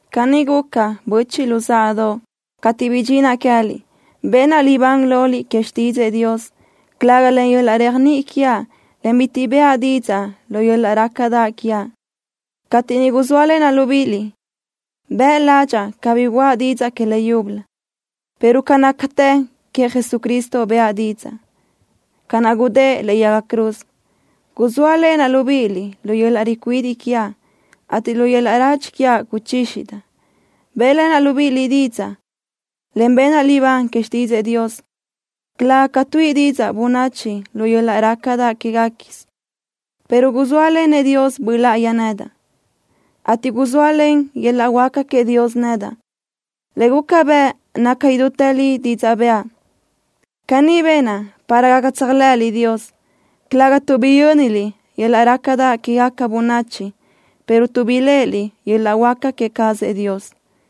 Caní guca, böchiʼ luzáʼadoʼ, cateʼ bidxinaʼ queë́liʼ. Benaʼ libán loliʼ que xtídzëʼë Dios, calëga len yöl-laʼ réajniʼi quiaʼ, en bitiʼ bëʼa didzaʼ lu yöl-laʼ rácadaʼ quiaʼ. Cateʼ niʼ guzóalenaʼ libíʼiliʼ, bëʼ ládxaʼa cabí guʼa didzaʼ que le yúbölö, pero ca nácatë queëʼ Jesucristo bëʼa didzaʼ, ca naʼ gudë́ʼë lëʼe yaga cruz. Guzóalenaʼ libíʼiliʼ lu yöl-laʼ ricuidiʼ quiaʼ, ateʼ lu yöl-laʼ radxi quiaʼ guzxízidaʼa. Bë́ʼlenaʼ libíʼiliʼ didzaʼ, en benaʼ libán que xtídzëʼë Dios, calëga ca tuíʼi didzaʼ bönachi lu yöl-laʼ rácadaʼ quéguequisö, pero guzóalenëʼ Dios Böʼ Láʼayi nedaʼ, ateʼ guzóalen yöl-laʼ huáca queëʼ Dios nedaʼ, le guca bëʼ naca idútë li didzaʼ bëʼa. Caní benaʼ para gaca tséajlëʼëliʼ Dios, calëga tuʼ biyö́niliʼ yöl-laʼ rácadaʼ quégaca bönachi, pero tuʼ biléʼeliʼ yöl-laʼ huáca queë cazëʼ Dios.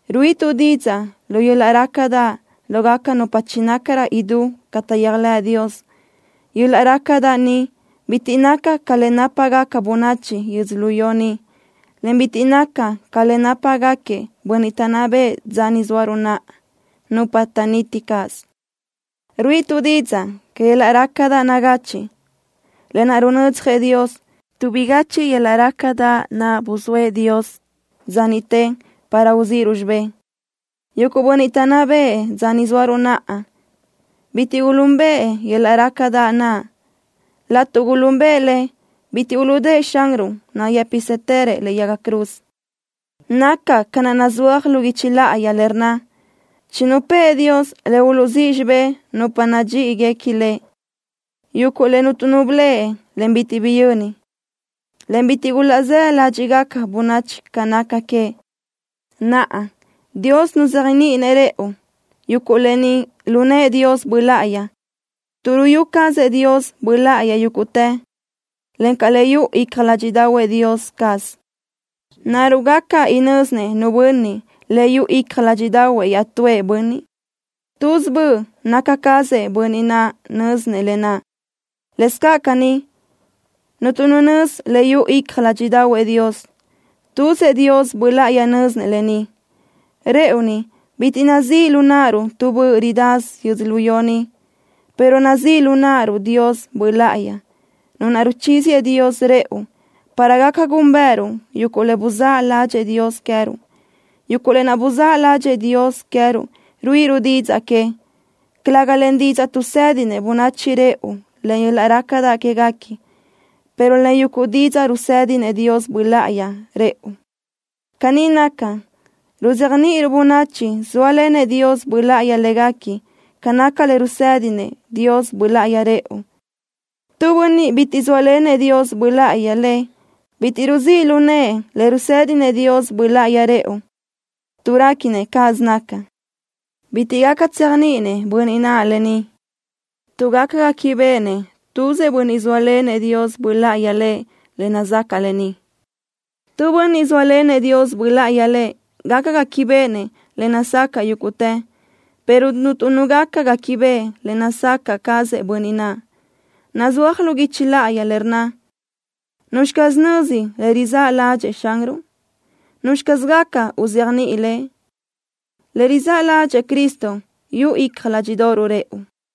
Ruíʼituʼ didzaʼ lu yöl-laʼ rácadaʼ lógaca nupa chinácarö idú ca taʼyéajlëʼ Dios. Yöl-laʼ rácadaʼ ni bitiʼ naca ca le nápagaca bönachi yödzölió ni, en bitiʼ naca ca le nápagaquiëʼ bönniʼ taʼnná bëʼë dza ni zóaruʼ naʼa, nupa naʼ taʼniti caz. Ruíʼituʼ didzaʼ que yöl-laʼ rácadaʼ nagachiʼ, lë naʼ runödzjëʼ Dios, tuʼ bigachiʼ yöl-laʼ rácadaʼ naʼ buzóëʼ Dios dza niʼte para uzíʼiruʼ xibé. Yuguʼ bönniʼ taʼnná bëʼë dza ni zóaruʼ naʼa bitiʼ gulúnbëʼë yöl-laʼ rácadaʼ naʼ. Laʼtuʼ gulúnbëʼë le, bitiʼ uluʼdë́ʼë Xanruʼ nayë́pisëtërëʼ lëʼe yaga cruz. Naca ca naʼ nazúaj lu guichi láʼayi le rnna: Chinupë́ʼë Dios le uluʼzíʼ xibé nupa nadxíʼiguequi Lëʼ, yuguʼ le cuntu nu bleʼe, en bitiʼ biyö́ni, en bitiʼ gulaʼzáʼ ládxiʼgaca bönachi ca naca que. Naʼa, Dios nuzéajniʼinëʼ rëʼu yuguʼ lë ni lu nëʼë Dios Böʼ Láʼayi, tuʼ ruyú cazëʼ Dios Böʼ Láʼayi yúguʼtë, encaʼ le yuʼu icja ládxiʼdaʼahuëʼ Dios caz. ¿Naruʼ gaca inö́zinëʼ nu bönniʼ le yuʼu icja ládxiʼdaʼahuëʼ iaʼtúëʼ bönniʼ? Tuz böʼ naca cazëʼ bönniʼ naʼ nözi lë naʼ. Lëscaʼ caní, cuntu nu nözi le yuʼu icja ládxiʼdaʼahuëʼ Dios. Tuzëʼ Dios Böʼ Láʼayi nö́zinëʼ lë ni. Rëʼu ni, bitiʼ nazíʼ lu náʼaruʼ tu böʼ ridasö yödzölió ni, pero nazíʼ lu náʼaruʼ Dios Böʼ Láʼayi, Nu naʼ ruchíziëʼ Dios rëʼu para gaca gúnbëʼëruʼ yuguʼ le buzáʼ ládxëʼë Dios queë́ruʼ. Yuguʼ lë naʼ buzáʼ ládxëʼë Dios queë́ruʼ ruíʼiruʼ didzaʼ que, calëga len didzaʼ tuʼsédinëʼ bönachi rëʼu len yöl-laʼ rácadaʼ quéguequi, pero len yuguʼ didzaʼ rusédinëʼ Dios Böʼ Láʼayi rëʼu. Caní naca, ruzéajniʼiruʼ bönachi zóalenëʼ Dios Böʼ Láʼayi légaquiëʼ ca naca le rusédinëʼ Dios Böʼ Láʼayi rëʼu. Tu bönniʼ bitiʼ zóalenëʼ Dios Böʼ Láʼayi lëʼ bitiʼ rizíʼ lu nëʼë le rusédinëʼ Dios Böʼ Láʼayi rëʼu, tuʼ réquinëʼ cáʼasö naca. Bitiʼ gaca tséajniʼinëʼ bönniʼ naʼ lë ni, tuʼ gaca guéquibeʼenëʼ tuzëʼ bönniʼ zóalenëʼ Dios Böʼ Láʼayi lëʼ le nazacaʼ lë ni. Tu bönniʼ zóalenëʼ Dios Böʼ Láʼayi lëʼ gaca guéquibeʼenëʼ le nazacaʼ yúguʼtë, pero cuntu nu gaca guéquibeʼe le nazacaʼ cazëʼ bönniʼ naʼ. Nazúaj lu guichi láʼayi le rnna: ¿Nuzxi caz nözi le rizáʼ ládxëʼë Xanruʼ? ¿Nuzxi caz gaca uzéajniʼi Lëʼ? Le rizáʼ ládxëʼë Cristo yuʼu icja ládxiʼdoʼoruʼ rëʼu.